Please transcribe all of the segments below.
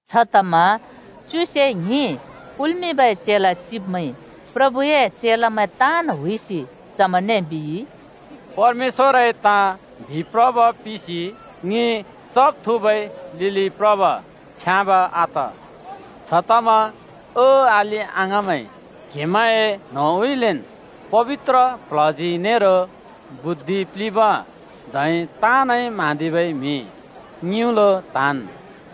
छतमा च्युसे ङ्हिं कुल्मिंबै चेला चिब्मैंइ प्रभुए चेलामैं ताँन् हुइसि चमैंने बिइ, “परमेश्‍वरए ताँ बिप्रब पिसि ङि चब् थुँबै लिलि प्रब छ्याँब आत। छतमा ओ अलि-अङाँमैं, क्हेमैंए न्होंउँइँलेन् पबित्र प्ल्हजी नेरो बुद्धिइ प्लिंब धै ताँनइ म्हाँदिबै म्हि ङिउँलो त्हाँन्।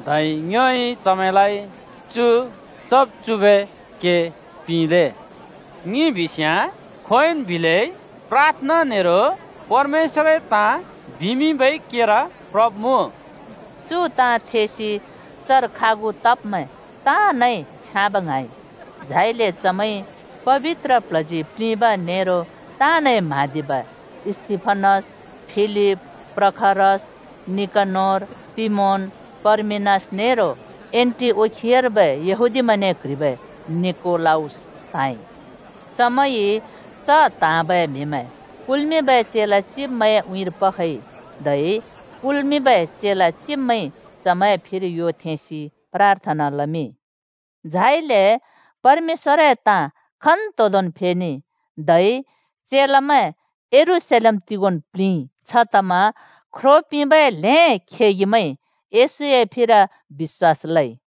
धै ङ्योइ चमैंलाइ चु चब् चुबै के पिंले। ङि बिस्याँ खोंयोंन् बिलै प्राथना नेरो परमेश्‍वरए ताँ बिमिंबै केर प्रब्मुँ।” चु ताँ थेसि चर खागु तब्मैं ताँनइ छ्याँब ङ्हाँइ झाइले चमैंइ पबित्र प्ल्हजी प्लिंब नेरो ताँनइ म्हाँदिबै, स्तिफनस, फिलिप, प्रखरस, निकनोर, तिमोन, पर्मिनास नेरो एन्‍टिओखियार्बै येहूदिमैंने क्ह्रिबै निकोलाउस त्हाँइ। चमैंइ च त्हाँबै म्हिमैं कुल्मिंबै चेला चिब्मैंए उँइँर पखइ धै कुल्मिंबै चेला चिब्मैंइ चमैंए फिर यो थेंसि प्राथना लमिंइ। झाइले परमेश्‍वरए ताँ खन्तोंदोंन् फेनेइ, धै चेलामैं यरूशलेम तिगोंन् प्लिंइ। छतमा ख्रो पिंबै ल्हें खेगिमैंइ येशूए फिर बिश्‍वास लइ।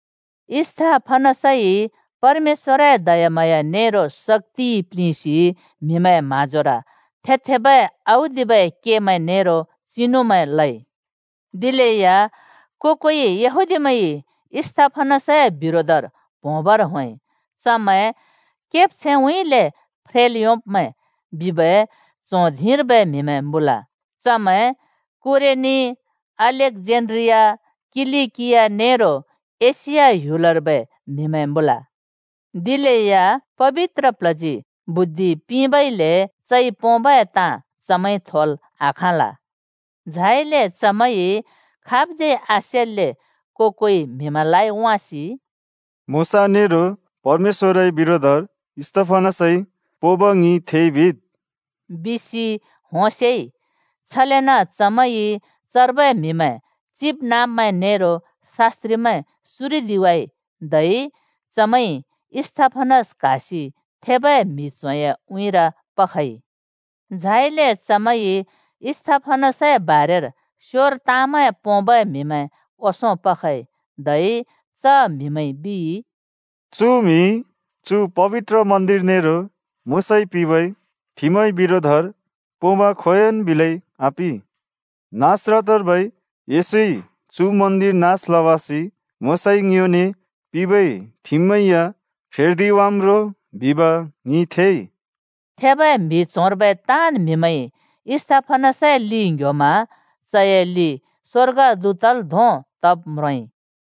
स्तिफनसइ परमेश्‍वरए दयाम्हाँया नेरो शक्‍तिइ प्लिंसि म्हिमैंए म्हाँजोर थेबै औदिबै के नेरो चिनुमैं लइ। दिलेया को-कोइ यहूदीमैंइ स्तिफनसए बिरोधर प्होंबर होंइ। (चमैं “केब्छैंउँइँले फ्रेल् योंब्मैं” बिबै च्हों धिंर्बै म्हिमैं मुँल। चमैं कुरेनी, अलेक्जेन्ड्रिया, किलिकिया नेरो एशिया बिबै ह्‍युलर्बै म्हिमैं मुँल।) दिलेया पबित्र प्ल्हजी स्तिफनसलाइ बुद्धि पिंबइले चइ पोंबै ताँ चमैंइ थोल् आखाँल। झाइले चमैंइ खाबज्यै आसेल्‍ले को-कोइ म्हिमैंलाइ वाँसि “मोशा नेरो परमेश्‍वरए बिरोधर स्तिफनसइ पोंब ङिइ थेइ, बिद्,” बिसि होंसेइ। छलेन चमैंइ चर्बै म्हिमैं, चिबनाँब्मैं नेरो शास्‍त्रिमैं सुरिदिवाइ, धै चमैंइ स्तिफनस क्हासि थेबै म्हि च्होंए उँइँर पखइ। झाइले चमैंइ स्तिफनसए बारेर स्योर ताँमैं पोंबै म्हिमैं ओंसों पखइ। धै च म्हिमैंइ बिइ, “चु म्हिइ चु पबित्र मन्दिर नेरो मोशाइ पिंबै ठिमए बिरोधर पोंब खोंयोंन् बिलै आपि। नासरतर्बै येशूइ चु मन्दिर नास लवासि मोशाइ ङ्योने पिंबै ठिममैं या फेर्दिवाम् रो बिब ङिइ थेइ!” थेबै म्हि च्होंर्बै ताँन् म्हिमैंइ स्तिफनसए लि ङ्ह्‍योमा चए लि स्वर्गदूतल् धोंन् तब् म्रोंइ।